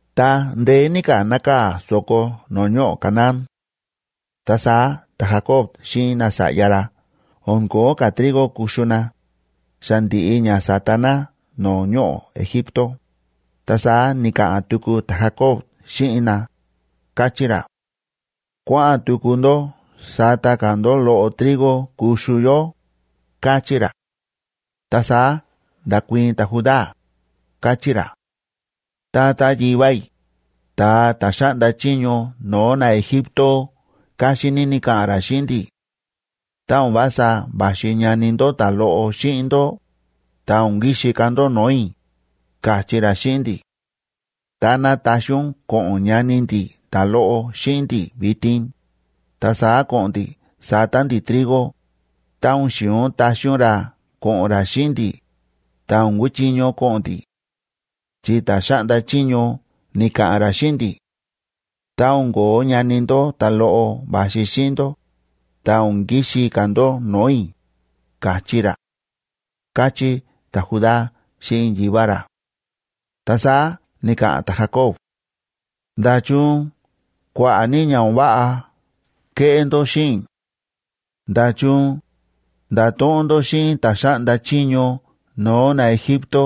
Ta ndeé ní ka̱ nákaa̱ so̱ko no̱o̱ ñoꞌo̱ Canaán. Ta saá ta̱Jacob xíꞌin nasa̱ꞌya ra o̱n ko̱ó ka̱ trigo kuxu na, xa ndi̱ꞌi ña sa̱ta na no̱o̱ ñoꞌo̱ Egipto, ta saá ni̱ka̱ꞌa̱n tuku ta̱Jacob xíꞌin na, káchí ra: ―Kua̱ꞌa̱n tuku ndó sata ka̱ ndó loꞌo trigo kuxu yó ―káchí ra. Ta saá nda̱kuii̱n ta̱Judá, káchí ra: ―Tata yivá i̱, ta̱a ta̱ xáꞌnda chiño no̱o̱ naEgipto káxín ní ni̱ka̱ꞌa̱n ra xíꞌin ndi̱: “Tá o̱n vása va̱xi ñani ndó ta̱loꞌo xíꞌin ndó, ta o̱n kixi ka̱ ndó no̱o̱ i̱”, ka̱chí ra xíꞌin ndi̱. Táná taxi ún ko̱ꞌo̱n ñani ndi̱ ta̱loꞌo xíꞌin ndi̱ vitin, ta saá ko̱ꞌo̱n ndi̱ sata ndi̱ trigo; tá o̱n xi̱in ún taxi ún ra ko̱ꞌo̱n ra xíꞌin ndi̱, ta o̱n kuchiño ko̱ꞌo̱n ndi̱. Chi ta̱ xáꞌnda chiño ni̱ka̱ꞌa̱n ra xíꞌin ndi̱: “Tá o̱n ko̱ó ñani ndó ta̱loꞌo va̱xi xíꞌin ndó, ta o̱n kixi ka̱ ndó no̱o̱ i̱”, ka̱chí ra ―káchí ta̱Judá xíꞌin yivá ra. Ta saá ni̱ka̱ꞌa̱n ta̱Jacob:a ―¿Nda̱chun kua̱ꞌa̱ ní ña o̱n váꞌa kéꞌé ndó xíꞌin i̱? ¿Nda̱chun nda̱to̱ꞌon ndó xíꞌin ta̱ xáꞌnda chiño no̱o̱ naEgipto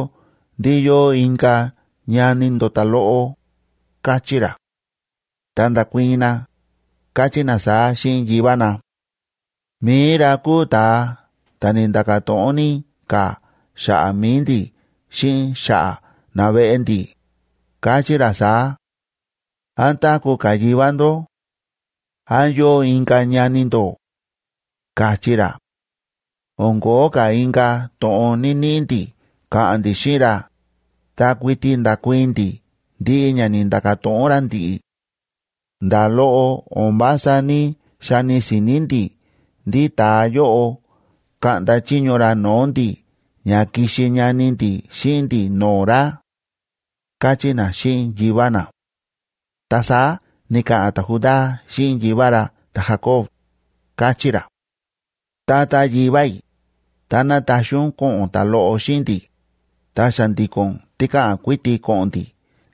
ndí yóo inka̱ ñani ndó ta̱loꞌo? ―káchí ra. Ta nda̱kuii̱n na, káchí na saá xíꞌin yivá na: ―Mi̱i ra kúu ta̱a ta̱ ni̱nda̱ka̱ to̱ꞌon ní ka̱ xa̱ꞌa̱ mi̱i ndi̱ xíꞌin xa̱ꞌa̱ naveꞌe ndi̱, ka̱chí ra saá: “¿Án táku̱ ka̱ yivá ndó? ¿Án yóo inka̱ ñani ndó?”, ka̱chí ra. O̱n ko̱ó ka̱ inka̱ to̱ꞌon ní‑niꞌi ndi̱ ka̱ꞌa̱n ndi̱ xíꞌin ra, ta kuiti nda̱kuii̱n ndi̱ ndiꞌi ña ni̱nda̱ka̱ to̱ꞌon ra ndi̱ꞌi̱. Nda̱ loꞌo o̱n vása ní‑xani si̱ni̱ ndi̱ ndí ta̱a yóꞌo kaꞌnda chiño ra no̱o̱ ndi̱ ña kixi ñani ndi̱ xíꞌin ndi̱ no̱o̱ ra ―káchí na xíꞌin yivá na. Ta saá ni̱ka̱ꞌa̱n ta̱Judá xíꞌin yivá ra ta̱Jacob, káchí ra: ―Tata yivá i̱, táná taxi ún ko̱ꞌo̱n ta̱loꞌo xíꞌin ndi̱, ta xa̱ndi̱ko̱n tikáꞌan kuiti ko̱ꞌo̱n ndi̱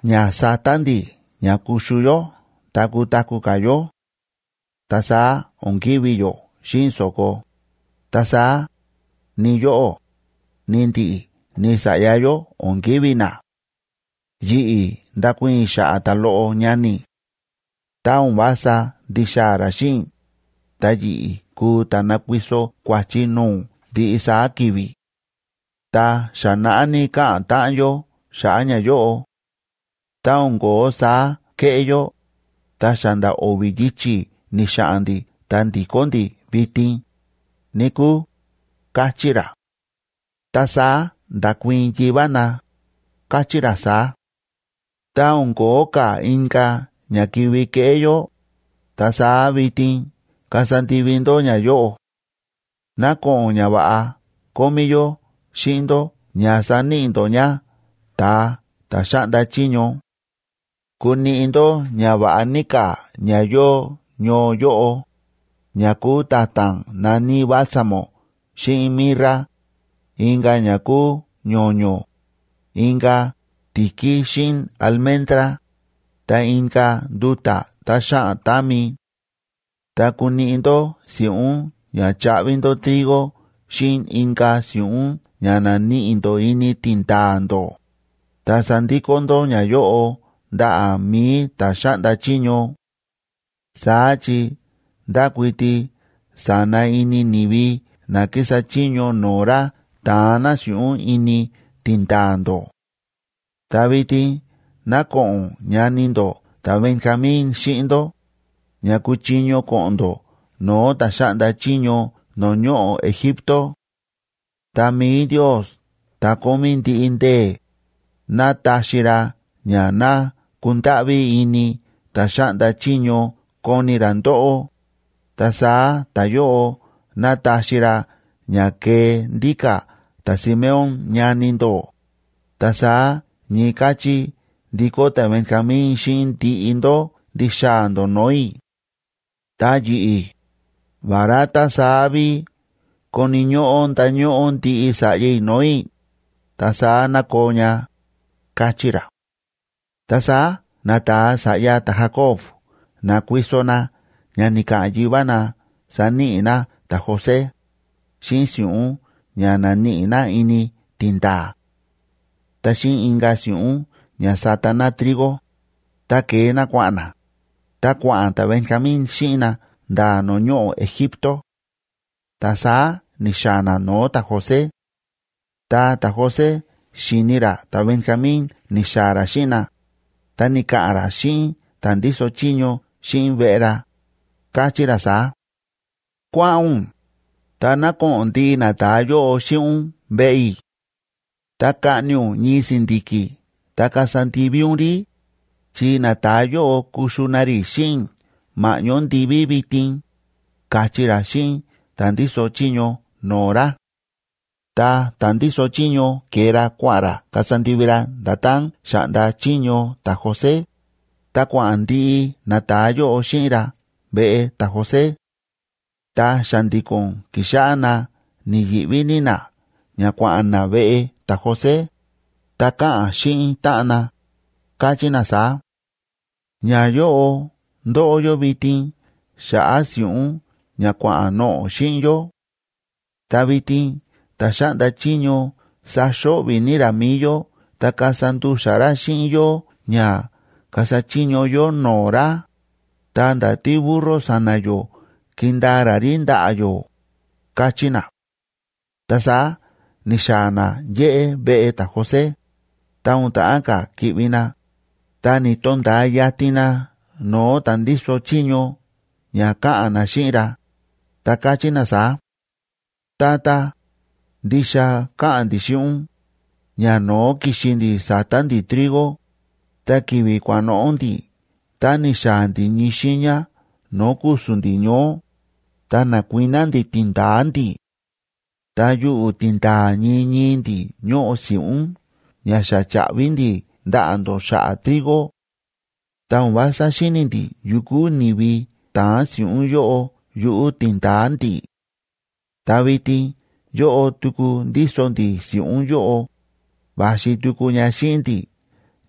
ña sata ndi̱ ña kuxu yó ta kutaku̱ ka̱ yó. Ta saá o̱n kivi̱ yó xíꞌin so̱ko, ta saá, ni yóꞌó, ni ndi̱ꞌi̱, ni sa̱ꞌya yó o̱n kivi̱ na. Yi̱ꞌi̱ ndakuii̱n i̱ xa̱ꞌa̱ ta̱loꞌo ñani i̱. Tá o̱n vása ndixaa̱ ra xíꞌin i̱, ta yi̱ꞌi̱ kuu ta̱ nakuiso kua̱chi no̱o̱ ún ndiꞌi saá ki̱vi̱. Ta xa naꞌá ní káꞌa̱n táꞌan yó xa̱ꞌa̱ ñayóꞌo; tá o̱n ko̱ó saá kéꞌé yó, ta xa nda̱ o̱vi̱ yichi̱ ni̱xa̱ꞌa̱n ndi̱ ta ndi̱kó ndi̱ vitin, níkúu ―káchí ra. Ta saá nda̱kuii̱n yivá na, káchí ra saá: ―Tá o̱n ko̱ó ka̱ inka̱ ña kivi keꞌé yó, ta saá vitin kasa ndivi ndó ñayóꞌo: ná ko̱ꞌo̱n ñava̱ꞌa kómí yó xíꞌin ndó ña saníꞌi ndó ña ta̱a ta̱ xáꞌnda chiño. Kuniꞌi ndó ñava̱ꞌa ní ka̱ ña yóo ñoo yóꞌo, ña kúu ta̱ta̱n na̱ní bálsamo xíꞌin mirra, inka̱ ña kúu ño̱ño̱, inka̱ ti̱kí xíꞌin almendra, ta inka̱ nduta̱ tá xáꞌan támi. Ta kuniꞌi ndó si̱ꞌún ña chaꞌvi ndó trigo xíꞌin inka̱ si̱ꞌún ña na̱níꞌi ndó ini tindaa̱ ndó, ta sandikó ndó ñayóꞌo ndaꞌa̱ mi̱i ta̱ xáꞌnda chiño. Saá chi ndákuiti sa̱na ini ni̱vi na kísa chiño no̱o̱ ra ta̱an na si̱ꞌún ini tindaa̱ ndó. Ta vitin ná ko̱ꞌo̱n ñani ndó ta̱Benjamín xíꞌin ndó, ña kuchiño ko̱ꞌo̱n ndó no̱o̱ ta̱ xáꞌnda chiño no̱o̱ ñoꞌo̱ Egipto. Ta mi̱i Ndios ta̱ Kómí Ndiꞌi Ndee̱, ná taxi ra ña ná kundáꞌví ini ta̱ xáꞌnda chiño koni ra ndóꞌó, ta saá ta̱yóꞌo ná taxi ra ña kee ndíka̱ ta̱Simeón ñani ndó, ta saá ñii káchí ndikó ta̱Benjamín xíꞌin ndiꞌi ndó ndixaa̱ ndó no̱o̱ i̱. Ta yi̱ꞌi̱, vará tá saá ví koni̱ ñóꞌó ndañóꞌó ndiꞌi sa̱ꞌya i̱ no̱o̱ i̱, ta saá ná koo ña ―káchí ra. Ta saá nata̱a sa̱ꞌya ta̱Jacob na̱kuiso na ña ni̱ka̱ꞌa̱n yivá na saníꞌi na ta̱José, xíꞌin si̱ꞌún ña na̱níꞌi na ini tindaa̱, ta xíꞌin inka̱ si̱ꞌún ña sata na trigo, ta ke̱e na kua̱ꞌa̱n na, ta kua̱ꞌa̱n ta̱Benjamín xíꞌin na nda̱ no̱o̱ ñoꞌo̱ Egipto. Ta saá ni̱xaa̱ na no̱o̱ ta̱José. Ta ta̱José xi̱ni ra ta̱Benjamín ni̱xaa̱ ra xíꞌin na, ta ni̱ka̱ꞌa̱n ra xíꞌin ta̱ ndíso chiño xíꞌin veꞌe ra, káchí ra saá: ―Kua̱ꞌa̱n ún, ta ná ko̱ꞌo̱n ndiꞌi nata̱a yóꞌo xíꞌin ún veꞌe i̱. Ta kaꞌni ún ñii si̱ndi̱ki̱ ta kasa ndivi ún rí, chi nata̱a yóꞌo kuxu na rí xíꞌin i̱ ma̱ꞌñó ndiví vitin ―káchí ra xíꞌin ta̱ ndíso chiño no̱o̱ ra. Ta ta̱ ndíso chiño ke̱e ra kua̱ꞌa̱n ra kasa ndivi ra nda̱tán xa̱ꞌnda chiño ta̱José, ta kua̱ꞌa̱n ndiꞌi nata̱a yóꞌo xíꞌin ra veꞌe ta̱José; ta xa̱ndi̱ko̱n ki̱xáꞌá na ni̱yi̱ꞌví ní na ña kua̱ꞌa̱n na veꞌe ta̱José, ta káꞌa̱n xíꞌin táꞌan na, káchí na saá: ―Ñayóꞌo ndóꞌo yó vitin xa̱ꞌa̱ si̱ꞌún ña kua̱ꞌa̱n noꞌo̱ xíꞌin yó. Ta vitin ta̱ xáꞌnda chiño saxo̱ꞌvi̱ ní ra mi̱i yó ta kasa ndu̱xa̱ ra xíꞌin yó ña kasa chiño yó no̱o̱ ra, ta nda̱ tíburro sa̱na̱ yó kindaa ra rí ndaꞌa̱ yó ―káchí na. Ta saá ni̱xaa̱ na yéꞌé veꞌe ta̱José, ta o̱n ta̱ꞌán ka̱ ki̱ꞌvi na, ta ni̱to̱nda̱a yatin na no̱o̱ ta̱ ndíso chiño ña káꞌa̱n na xíꞌin ra, ta káchí na saá: ―Tata, ndixa káꞌa̱n ndi̱ xíꞌin ún, ñano̱ó ki̱xi ndi̱ sata ndi̱ trigo, ta ki̱vi̱ kua̱ꞌa̱n noꞌo̱ ndi̱ tá ni̱xaa̱ ndi̱ ñii xiiña no̱o̱ ku̱su̱n ndi̱ ñoó, ta na̱kuiná ndi̱ tindaa̱ ndi̱, ta yuꞌu̱ tindaa̱ ñii ñii ndi̱ ñóꞌo si̱ꞌún ña xa cha̱ꞌvi ndi̱ ndaꞌa̱ ndó xa̱ꞌa̱ trigo. Ta o̱n vása xíni̱ ndi̱ yukú ni̱vi ta̱an si̱ꞌún yóꞌo yuꞌu̱ tindaa̱ ndi̱. Ta vitin yóꞌo tuku ndíso ndi̱ si̱ꞌún yóꞌo, va̱xi tuku ña xíꞌin ndi̱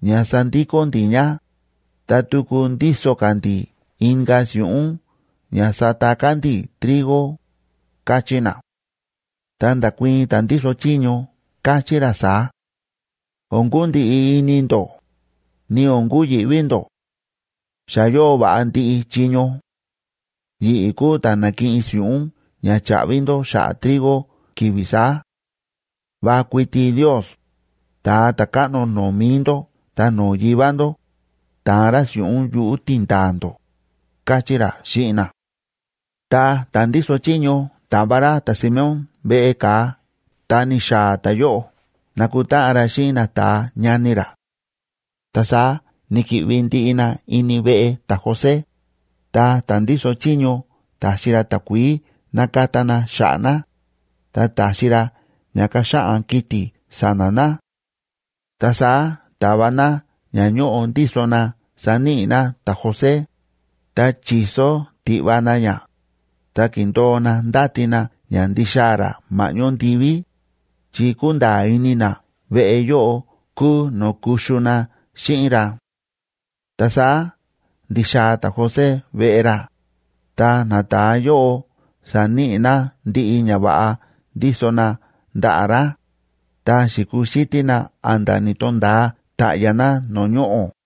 ña sandikó ndi̱ ña, ta tuku ndíso ka̱ ndi̱ inka̱ si̱ꞌún ña sata ka̱ ndi̱ trigo ―káchí na. Ta nda̱kuii̱n ta̱ ndíso chiño, káchí ra saá: ―O̱n kundiꞌi ini ndó, ni o̱n kuyi̱ꞌví ndó. Xa yóo va̱ꞌa ndiꞌi chiño. Yi̱ꞌi̱ kúu ta̱ na̱kiꞌin si̱ꞌún ña cha̱ꞌvi ndó xa̱ꞌa̱ trigo ki̱vi̱ saá. Va kuiti Ndios, ta̱a ta̱káꞌno no̱o̱ mi̱i ndó ta no̱o̱ yivá ndó, ta̱an ra si̱ꞌún yuꞌu̱ tindaa̱ ndó ―káchí ra xíꞌin na. Ta ta̱ ndíso chiño ta̱va ra ta̱Simeón veꞌe ka̱a ta ni̱xaa̱ ta̱yóꞌo na̱kutáꞌan ra xíꞌin nata̱a ñani ra; ta saá ni̱ki̱ꞌvi ndiꞌi na ini veꞌe ta̱José, ta ta̱ ndíso chiño ta̱xi ra takuií nakata na xa̱ꞌa̱ na, ta ta̱xi ra ña kaxaꞌan kiti̱ sa̱na̱ na. Ta saá ta̱va na ña ñóꞌo ndíso na saníꞌi na ta̱José, ta chi̱so tiꞌva na ña, ta ki̱ndo̱o na ndáti na ña ndixaa̱ ra ma̱ꞌñó ndiví, chi kúnda̱a̱ ini na veꞌe yóꞌo kúu no̱o̱ kuxu na xíꞌin ra. Ta saá ndi̱xaa̱ ta̱José veꞌe ra, ta nata̱a yóꞌo sa̱níꞌi na ndiꞌi ñava̱ꞌa ndíso na ndaꞌa̱ ra, ta xi̱kuxítí na a̱nda̱ ni̱to̱nda̱a ta̱ꞌya̱ na no̱o̱ ñoꞌo̱.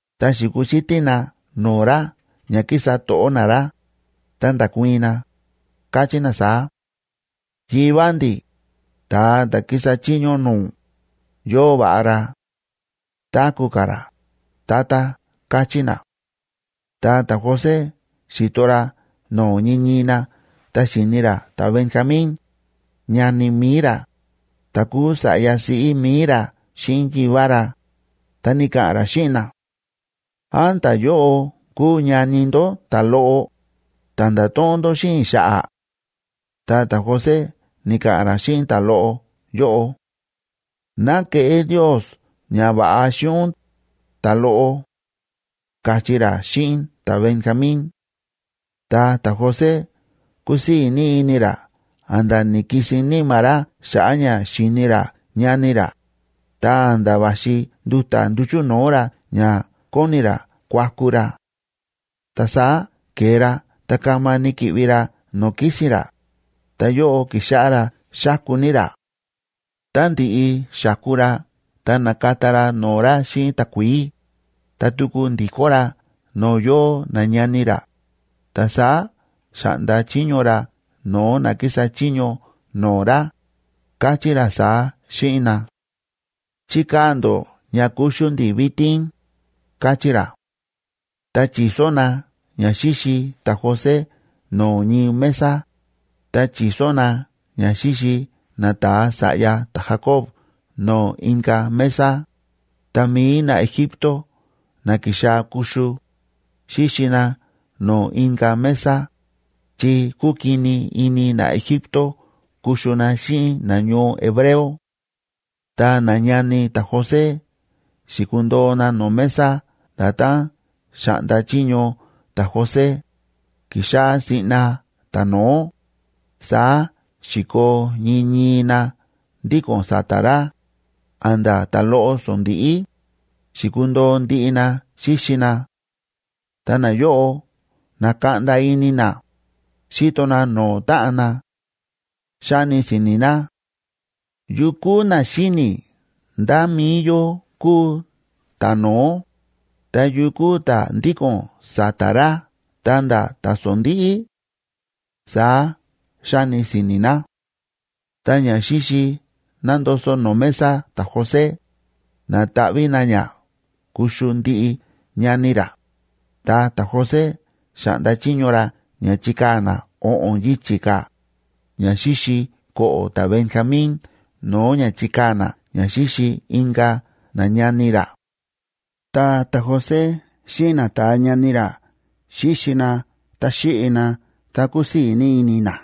Ta xi̱kuxítí na no̱o̱ ra ña kísa to̱ꞌó na ra, ta nda̱kuii̱n na, káchí na saá: ―Yivá ndi̱, ta̱a ta̱ kísa chiño no̱o̱ ún, yóo va̱ꞌa ra. Táku̱ ka̱ ra, tata ―káchí na. Ta ta̱José xi̱to ra no̱o̱ ñii ñii na ta xi̱ni ra ta̱Benjamín, ñani mi̱i ra ta̱ kúu sa̱ꞌya siꞌí mi̱i ra xíꞌin yivá ra, ta ni̱ka̱ꞌa̱n ra xíꞌin na: ―¿Án ta̱yóꞌo kúu ñani ndó ta̱loꞌo, ta̱ nda̱to̱ꞌon ndó xíꞌin i̱ xa̱ꞌa̱? Ta ta̱José ni̱ka̱ꞌa̱n ra xíꞌin ta̱loꞌo yóꞌo: ―Ná keꞌé Ndios ñava̱ꞌa xíꞌin ún, ta̱loꞌo ―káchí ra xíꞌin ta̱Benjamín. Ta ta̱José kúsii̱ ní ini ra a̱nda̱ ni̱kisin níma̱ ra xa̱ꞌa̱ ña xi̱ni ra ñani ra, ta a̱nda̱ va̱xi nduta̱ nduchu̱ no̱o̱ ra ña kóni ra kuaku ra. Ta saá ke̱e ra ta kama ni̱ki̱ꞌvi ra no̱o̱ kísi̱n ra, ta yóꞌo ki̱xáꞌá ra xáku ní ra. Tá ndi̱ꞌi xa̱ku ra ta na̱kata ra no̱o̱ ra xíꞌin takuií, ta tuku ndi̱kó ra no̱o̱ yóo nañani ra, ta saá xa̱ꞌnda chiño ra no̱o̱ na kísa chiño no̱o̱ ra, káchí ra saá xíꞌin na: ―Chikaa̱ ndó ña kuxu ndi̱ vitin ―káchí ra. Ta chi̱so na ña xíxi ta̱José no̱o̱ ñii mesa, ta chi̱so na ña xíxi nata̱a sa̱ꞌya ta̱Jacob no̱o̱ inka̱ mesa, ta mi̱i naEgipto na ki̱xaa̱ kuxu, xíxi na no̱o̱ inka̱ mesa, chi kúkini ini naEgipto kuxu na xíꞌin nañoo hebreo. Ta nañani ta̱José xi̱kundo̱o na no̱o̱ mesa nda̱tán xa̱ꞌnda chiño ta̱José, ki̱xáꞌá siꞌna ta̱no̱ó, saá xi̱koo ñii ñii na ndíko̱n sa̱ta̱ ra, a̱nda̱ ta̱loꞌo sondíꞌí, xi̱kundo̱o ndiꞌi na xíxi na; ta nayóꞌo na̱kaꞌnda ini na, xíto na no̱o̱ táꞌan na. Xáni si̱ni̱ na: “¿Yukú na xíni̱ ndá mi̱i yó kúu ta̱no̱ó, ta yukú ta̱ ndíko̱n sa̱ta̱ ra ta̱nda̱ ta̱sondíꞌí?”, saá xáni si̱ni̱ na. Ta ñaxíxi nándoso̱ no̱o̱ mesa ta̱José, na̱taꞌví na ña kuxu ndiꞌi ñani ra, ta ta̱José xa̱ꞌnda chiño ra ña chikaa̱ na o̱ꞌo̱n yichi̱ ka̱ ñaxíxi ko̱ꞌo̱ ta̱Benjamín no̱o̱ ña chikaa̱ na ña xíxi inka̱ nañani ra. Ta ta̱José xíꞌin nata̱a ñani ra xíxi na ta xíꞌi na, ta kúsii̱ ní ini na.